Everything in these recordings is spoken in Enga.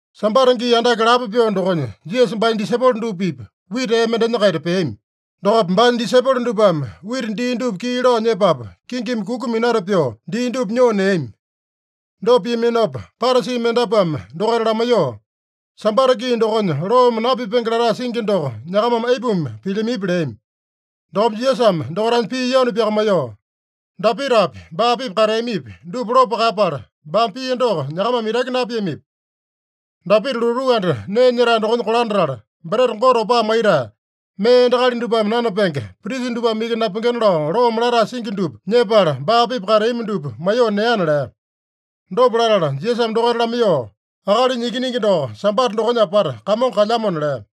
Sambata gii andake lapo pyoo dokonya Jisasa baanya disaipolo dupa-pipa wita ee mendenya-kaita peami. Dokopa baanya disaipolo dupame wita dii dupa kii lao nyepapu, kingimi kuku minata pyoo, dii dupa nyoo neami. Dopa piaminopa Parasi mendapuame dokaita lamaiyoo, “Sambata gii dokonya loome napipenge latae singi doko nyakamame aipuma pilyamipi?” leami. Dokopa Jisasame dokaitanya pii yanu pyakamaiyoo, “Dapitapi, baa-pipa kateamipi, dupa lopo kaeyapala, baame pia doko nyakamame itaki napiamipi? Dapita lotuu anda nee nyetae dokonya kolandatala, breta Gote opaa maitae, mee endakali dupame nanapenge, prisa dupame iki napengena lao loome latae singi dupa nyepala, baa-pipa kateami dupa maiyoo neana” lea. Dopa latala Jisasame dokaita lamaiyoo, “Akalinya Ikiningi doko Sambata dokonya apata Kamongo kalyamona” lea.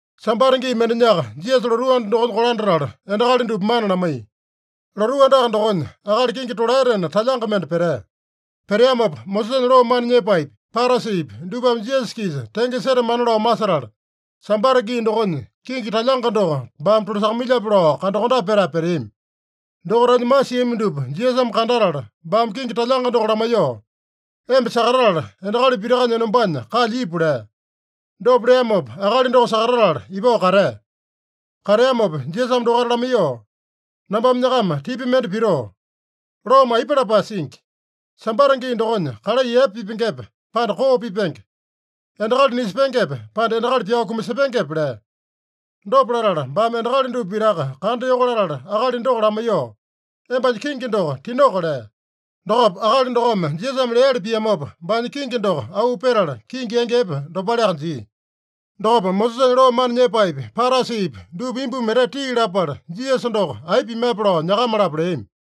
Sambata gii mendenyaka Jisasa lotuu anda dokonya kolandatala, endakali dupa mana lamaiya. Lotuu andaka dokonya akali kingi tolaetena talyanga mende petea. Peteamopa Mosesanya loo mana nyepaepi, Parasipi dupame Jisasa-kisa tenge setamana lao masetala, Sambata gii dokonya kingi talyanga doko baame tolasakamailyape lao kandakondape petae peteami. Dokaitanya masiami dupa Jisasame kandatala, baame kingi talyanga doko lamaiyoo, “Emba sakatatala, endakali pitakanya enombanya kalya ipu” lea. Dopa leamopa akali doko sakatatala ipao katea. Kateamopa Jisasame dokaita lamaiyoo, “Nambame nyakama tipa mende pitoo: Loome aipa lapae singi? Sambata gii dokonya kalai epe pipengepe, pande koo pipenge? Endakali nisepengepe, pande endakali pyao kumasepengepe?” lea. Dopa latala, baame endakali dupa pitaka kandayoko latala, akali doko lamaiyoo, “Embanya kingi doko tinoko” lea. Dokopa akali dokome Jisasame leali piamopa, baanya kingi doko auu petala kingi yangi epe dopaleaka jia. Dokopa Mosesanya loo mana nyepaepi, Parasipi dupa imbumi etete tii lapala, Jisasa doko aipa pimape lao nyakama-lapo leami.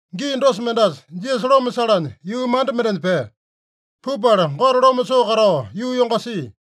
Gii dosa mendasa Jisasa loma salanya yuu manda mendenya pea. Pupala Gote loma soo katao yuu yongasia.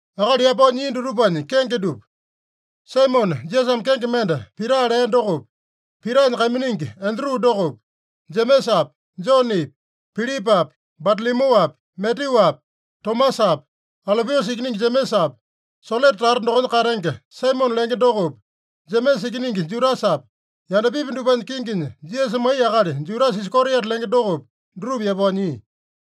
Akali yapao nyia dutupanya kenge dupa: Saimone, Jisasame kenge mende Pita lea dokopi, Pitanya kaiminingi Andru dokopi, Jemesapi, Jonepi, Pilipapi, Batalomyuapi, Matyuapi, Tomasapi, Alopiusa ikiningi Jemesapi, Selote tata dokonya katenge Saimone lenge dokopi, Jemesa ikiningi Judasapi, yandapipi dupanya kinginya Jisasa maiya akali Judasa Iskariota lenge dokopi, dutupa yapao nyia.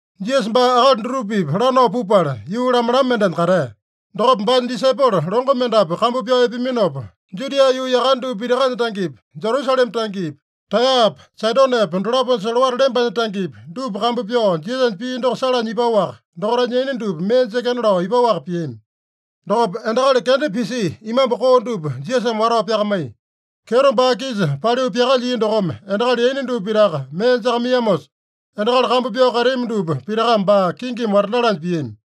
Jisasa baa akali dutupa-pipa lanao pupala, yuu lamalama mendenya katea. Dokopa baanya disaipolo longo mendapu kambu pyao epeaminopa, Judia yuu yakane dupa pitakanya tangepi, Jerusalema tangepi, Taeyapa Saidonepa dolaponya solowata lembanya tangepi, dupa kambu pyao Jisasanya pii doko salanya ipaowaka, dokaitanya yaina dupa mee jekena lao ipaowaka piami. Dokopa endakali kenda pisia imambu koo dupa Jisasame watao pyakamaiya. Kyeto baa-kisa paliu pyakalyia dokome endakali yaina dupa pitaka mee jakamaiyamosa, endakali kambu pyao kateami dupa pitakame baa kingimi watandalanya piami.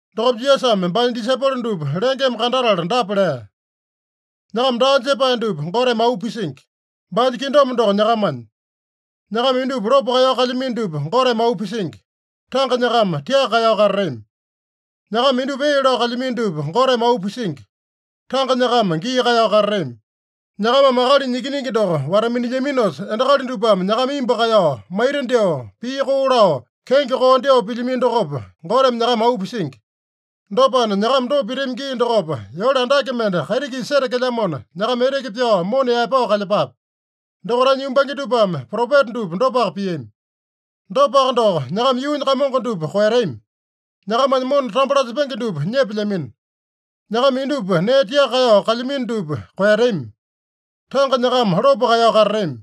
Dokopa Jisasame baanya disaipolo dupa lengeme kandatala dapa lea: “Nyakama daa jepae dupa Goteme auu pisingi. Baanya kingdom doko nyakamanya. “Nyakama indupa lopo kaeyao kalyamino dupa Goteme auu pisingi. Tanga nyakama tiaka kaeyao katatami. “Nyakama indupa ee lao kalyamino dupa Goteme auu pisingi. Tanga nyakama gii kaeyao katatami. “Nyakamame Akalinya Ikiningi doko wata-minilyaminosa, endakali dupame nyakama imbu kaeyao, maita dyoo, pii koo lao, kenge koo dyoo pilyamino dokopa, Goteme nyakama auu pisingi. Dopana, nyakama dopa pitami gii dokopa, yole andake mende kaiti-kisa setekelyamona, nyakama eteke pyao mona yaepao kalyepape. Dokaitanya yumbange dupame propeta dupa dopaka piami. “Dopaka doko, nyakama yuunya kamongo dupa koeyatami. Nyakamanya mona tambo lasepenge dupa nyepelyamino. “Nyakama indupa nee tiaka kaeyao kalyamino dupa koeyatami. Tanga nyakama lopo kaeyao katatami.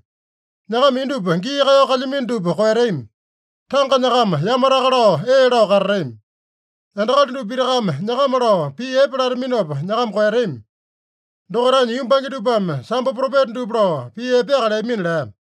“Nyakama indupa gii kaeyao kalyamino dupa koeyatami. Tanga nyakama yamataka lao ee lao katatami. “Endakali dupa pitakame nyakama lao pii epe lataminopa nyakama koeyatami. Dokaitanya yumbange dupame sambo propeta dupa lao pii epeaka leamina” lea.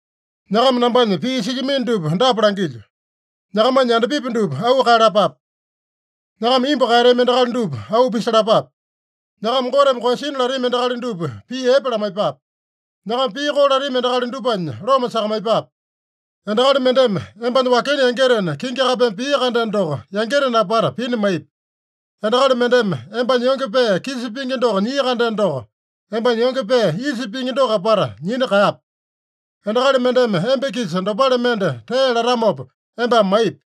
“Nyakama nambanya pii silyamino dupa dapa langilyo: Nyakamanya yandapipi dupa auu kaeyalapape. Nyakama imbu kaeyatami endakali dupa auu pisalapape. Nyakama Goteme koeyasina latami endakali dupa pii epe lamaiyepape. Nyakama pii koo latami endakali dupanya loma sakamaiyepape. Endakali mendeme embanya wakena yangitena kingi kapeme pia-kandeno doko, yangitena apata pina maipi. Endakali mendeme embanya yonge pee kisa pingi doko nyia-kandeno doko, embanya yonge pee isa pingi doko apata nyina kaeyape. Endakali mendeme emba-kisa dopale mende tee latamopa, embame maipi.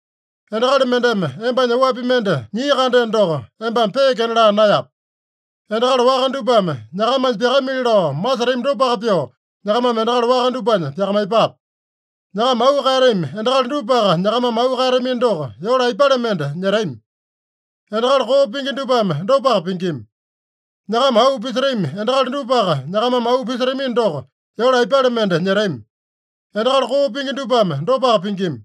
Endakali mendeme embanya oapi mende nyia-kandeno doko, embame peekena laa naeyape. Endakali waka dupame nyakamanya pyakamili lao masetami dopaka pyoo, nyakamame endakali waka dupanya pyakamaiyepape. Nyakama auu kaeyatami endakali dupaka nyakamame auu kaeyatamino doko, yole aipale mende nyetami? Endakali koo pingi dupame dopaka pingima. Nyakama auu pisetami endakali dupaka nyakamame auu pisetamino doko, yole aipale mende nyetami? Endakali koo pingi dupame dopaka pingima.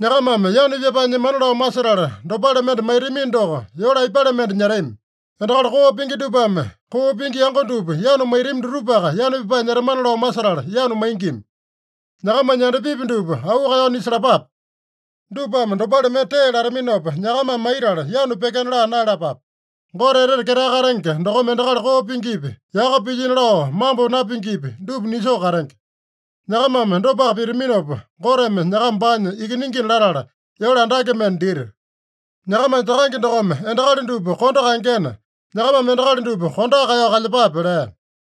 Nyakamame yanu pyapae nyemana lao masetala dopale mende maitamino doko, yole aipale mende nyetami? Endakali koo pingi dupame koo pingi yango dupa yanu maitami dutupaka yanu pyapae nyetamana lao masetala yanu maingima. Nyakamanya yandapipi dupa auu kaeyao nisalapape. Dupame dopale mende tee lataminopa nyakamame maitala, yanu pyekena laa naeyalapape. Gote Etete Ketae Katenge dokome endakali koo pingipi, yaka pilyino lao mambo napingipi, dupa nisoo katenge. Nyakamame dopaka pitaminopa, Goteme nyakama baanya ikiningina latala, yole andake mende dita. Nyakamanya Takange dokome endakali dupa kondo kaengena, nyakamame endakali dupa kondoaka kaeyao kalyepape” lea.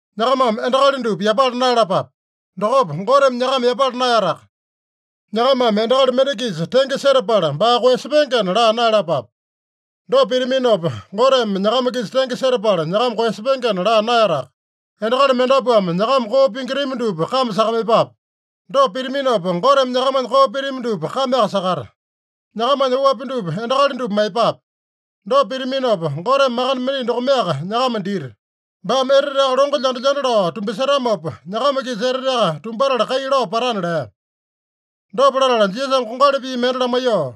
“Nyakamame endakali dupa yapala naeyalapape. Dokopa Goteme nyakama yapala naeyataka. Nyakamame endakali mende-kisa tenge setapala baa koeyasepengena laa naeyalapape. Dopa pitaminopa, Goteme nyakama-kisa tenge setapala nyakama koeyasepengena laa naeyataka. Endakali mendapuame nyakama koo pingitami dupa kame sakamaiyepape. Dopa pitaminopa, Goteme nyakamanya koo pitami dupa kameaka sakata. Nyakamanya oapi dupa endakali dupa maiyepape. Dopa pitaminopa, Goteme makande mendai dokomeaka nyakama dita. Baame eteteaka longo lyanda-lyanda lao tumbasetamopa, nyakama-kisa eteteaka tumbatala kai lao patana” lea. Dopa latala Jisasame kongali pii mende lamaiyoo,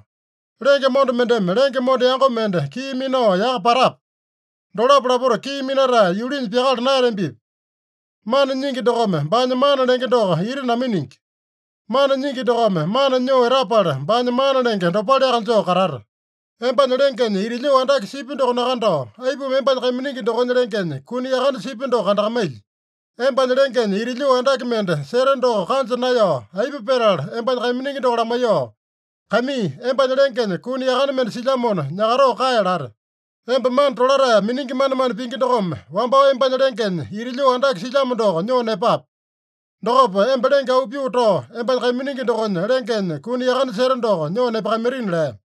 “Lenge monda mendeme lenge monda yango mende kii minao yaka patape? Dolapo lapota kii minatae yulinya pyakala naeyatambipi? Mana nyingi dokome baanya mana lenge doko ita naminingi. Mana nyingi dokome mana nyoo etapala, baanya mana lenge dopaleaka joo katata. Embanya lengenya ita lyoo andake sipya doko nakandao, aipuma embanya kaiminingi dokonya lengenya kuni yakane sipya doko kandakamailyi? Embanya lengenya ita lyoo andake mende seta doko kanja naeyao, aipa petala embanya kaiminingi doko lamaiyoo, ‘Kaimii, embanya lengenya kuni yakane mende silyamona, nyakatoo kae’ late? Emba mana tolatae miningi manemane pingi dokome, wambao embanya lengenya ita lyoo andake silyamo doko nyoo nepape. Dokopa emba lenge auu pyoo tao, embanya kaiminingi dokonya lengenya kuni yakane seta doko nyoo nepakamaitina” lea.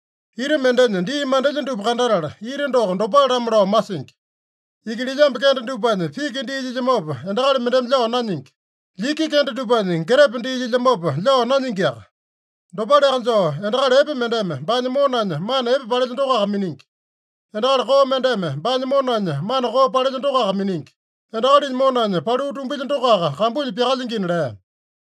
Ita mendenya dii mandelya dupa kandatala, ita doko dopale-lamo lao masingi. Ikililyambu kende dupanya piki dii lyilyamopa, endakali mendeme lyao nanyingi. Lyiki kende dupanya getepe dii lyilyamopa, lyao nanyingiaka. Dopaleaka joo, endakali epe mendeme baanya monanya mana epe palelya dokoaka miningi. Endakali koo mendeme baanya monanya mana koo palelya dokoaka miningi. Endakalinya monanya paliu tumbilya dokoaka kambunya pyakalyingina” lea.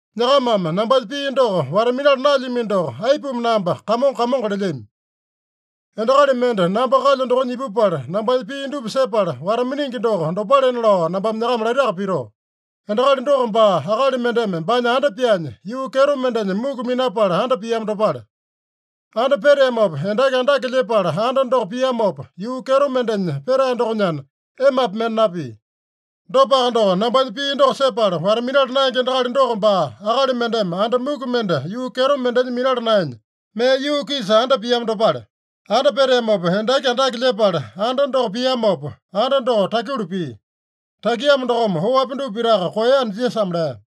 “Nyakamame nambanya pii doko wata-minala naelyamino doko, aipuma namba ‘Kamongo, Kamongo’ lelyami? Endakali mende namba kalyo dokonya ipupala, nambanya pii dupa sepala wata-miningi doko dopalena lao nambame nyakama laitaka pitoo: Endakali doko baa, akali mendeme baanya anda pyaanya, yuu kyeto mendenya muku minapala anda piamo dopale. Anda peteamopa, endaki andake lyepala anda doko piamopa, yuu kyeto mendenya petae dokonyana, emapi mende napia. Dopaka doko, nambanya pii doko sepala wata-minala naenge endakali doko baa, akali mendeme anda muku mende yuu kyeto mendenya minala naenya, mee yuu-kisa anda piamo dopale. Anda peteamopa, endaki andake lyepala anda doko piamopa, anda doko takyulu pia. Takiamo dokome, oapi dupa pitaka koeyana” Jisasame lea.